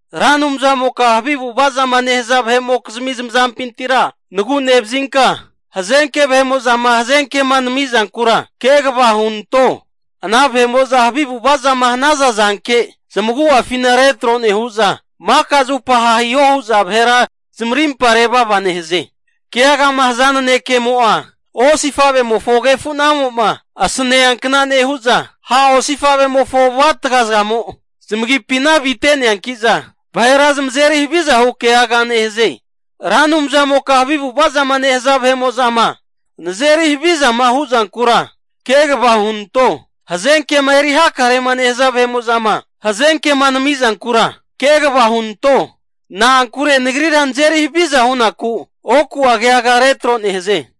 Ra Anumzamoka havi avu'ava zama nehaza vahe'mokizmi zamazampintira nagu'nevazinka, hazenke vahe'mo'zama hazenkema namizankura kegava hunanto. Ana vahe'mo'za havi avu'ava zama hanaza zanke zamagu'afina retro nehu'za, maka zupa ha' hiho hu'za vahera zamarimpa revava nehaze. Keagama haza nanekemo'a, osifavemofo agefunamo'ma asaneankna nehu'za, ha' osifavemofo avu'atga zamo zamagipina avite'neanki'za vahera zamazeri haviza hu keaga nehaze. Ra Anumzamoka havi avu'ava zama nehaza vahe'mo'zama nazeri havizama hu'zankura kegava hunanto. Hazenkema eri hakarema nehaza vahe'mo'zama hazenkema nami'zankura kegava hunanto, na'ankure nagrira nazeri haviza hunaku oku'a keaga retro nehaze.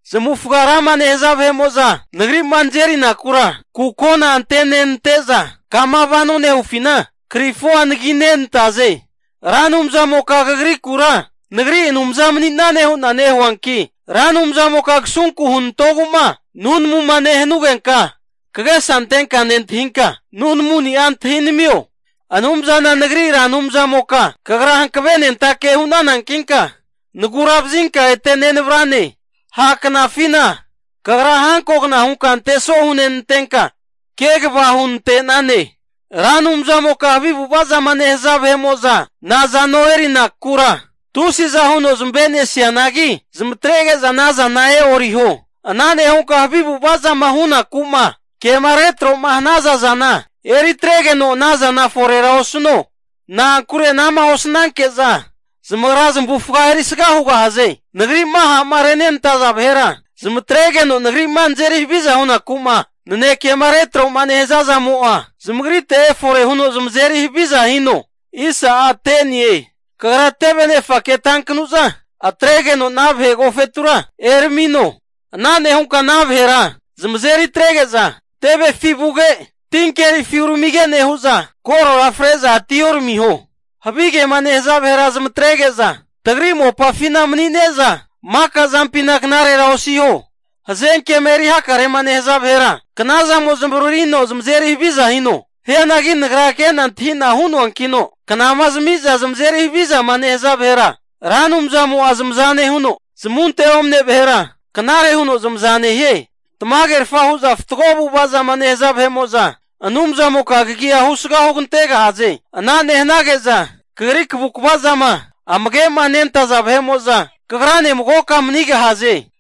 Zamavufga rama nehaza vahe'mo'za, nagrima nazerinakura kukona antenenante'za, kama vano nehufina krifua anaginentaze. Ra Anumzamoka Kagrikura, nagri Anumza mani'nane hu'na nehuanki, Ra Anumzamoka kasunku hunantogu'ma nunamuma nehanugenka, kagesa antenka nentahinka nunamuni'a antahinamio. Anumzana nagri Ra Anumzamoka Kagra hankavenentake hu'nanankinka nagura vazinka ete nenavrane. Ha' knafina kagra hankogna hunka anteso hunenantenka, kegava hunante'nane. Ra Anumzamoka havi avu'ava zama nehaza vahe'mo'za nazano erinakura tusiza huno zamave'nesianagi, zamatrege'za anazana e'oriho. Ana nehunka havi avu'ava zama hunaku'ma kema retro'ma hanaza zana eri atregeno, anazana forera osuno. Na'ankure ana'ma osnanke'za zamagra zamavufaga erisga hugahaze. Nagri'ma ha'ma renenantaza vahera, zamatregeno nagri'ma nazeri haviza hunaku'ma nanekema retro'ma nehaza zamo'a zamagrite efore huno zamazeri haviza hino. Kagra teve nefake tankanu'za, atregeno ana vahe agofetura eramino. Ana nehunka ana vahera zamazeri atrege'za tevefi vuge, tinkerifi uramige nehu'za, korora fre'za atioramiho. Havigema nehaza vahera zamatrege'za tagri mopafina manine'za, maka zampina knarera osiho. Hazenkema eri hakarema nehaza vahera, knazamo zamavaririno zamazeri haviza hino. Hianagi nagra ke'na antahi'na hu'noankino, knama zami'za zamazeri havizama nehaza vahera Ra Anumzamo'a zamaza nehuno, zamunte omane vahera knare huno zamaza nehie. Tamagerfa hu'za fatgo avu'ava zama nehaza vahe'mo'za, Anumzamoka kagi'a husga hugantegahaze. Ana nehanage'za Kagri kavukva zama amagemanentaza vahe'mo'za, kagrane magoka manigahaze.